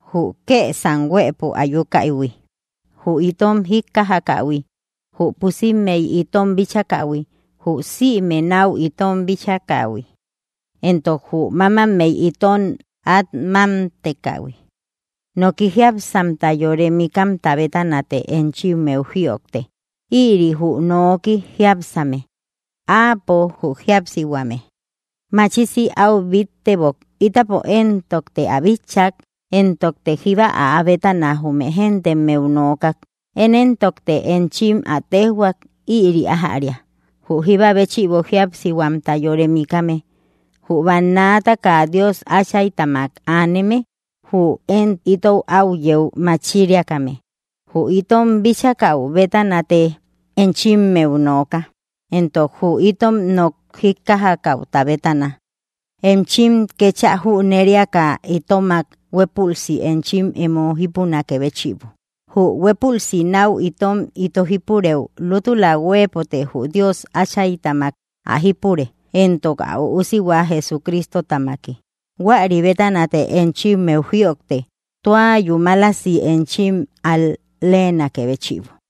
Jü kesam huëpo ayukäihui, jü itom jikkajakähui, jü pusimmey itom bichakähui, jü sïme nau itom bíchakähui, entok jü mamammey itom at mámtekähui, Noki jíapsihuamta yore mikamta bétanate enchimmeu jïojte. Ïri jü nooki jiápsame. Áapo, jü jíapsihuame machisi au bittebok. Ítapo éntokte ä bitchak, éntokte jíba áa bétana jume géntemmeu nookak; én éntokte enchim ä téjhua ïri ájäria, jü jíba béchïbo jíapsihuamta yore mikame, jü bannaataka Dios Áchaytamak aneme, jü én itou áu yeu machiriakame. Jü itom bíchakäu bétanate enchimmeu nooka, éntok jü itom nok jíkkajakäuta bétana, enchim kéchä jüneriaka itomak huépülsi enchim emo jípunakë béchïbo. Jü huépülsi náu itom ito jípurëu lútula huëpote jü Dios Áchaytamak ä jípure, éntok ä Üusihua Jesucristotamaki. Huäri bétanate enchimmeu jïojte tua yúmalasi enchim al‑leenakë béchïbo.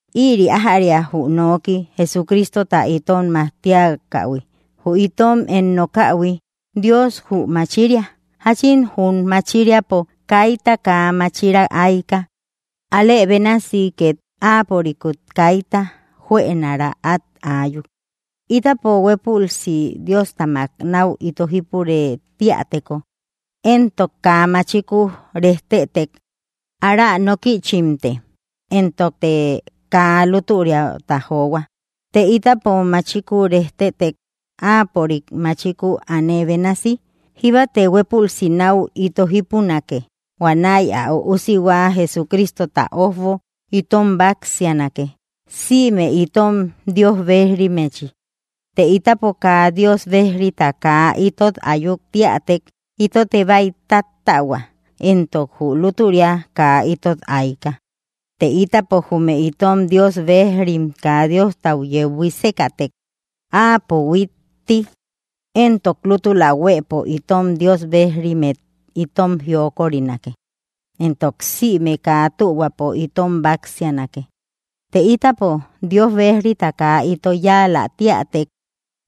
Ïri ájäria, jü nooki Jesucristota itom majtiakähui, jü itom én nokähui: Dios jü machiria. Jáchin jum machiriapo kaita kaa máchira ayka, alë bénasi két áapörikut kaita juënara at ayuk. Ítapo huépülsi Diostamak náu ito jípurë tíäteko, éntok kaa machiku rejtetek, ára nókïchimte, entokte kaa luturiata johua. Të ítapo machiku rejtetek, Áapörik, machiku aane bénasi, jíbate huépülsi náu ito jípunake, huanäi ä Üusihua Jesucristota ójbo itom báksianake, sïme itom Dios bejrimmechi. Të ítapo kaa Dios bejrita kaa itot ayuk tíätek, itote bäi táttähua. Entok jü lútüria kaa itot ayka. Të ítapo jume itom Dios bejrim kaa Diostau yeu buísekätek, Áapo huittti entok lútula huëpo itom Dios bejrimmet itom jiokorinake, entok sïme kaa tühuapo itom báksianake. Të ítapo Dios bejrita kaa ito yáalä tíätek,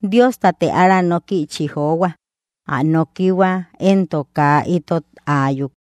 Diostate ára nókïchi johua. Ä nokihua entok kaa itot ayúk.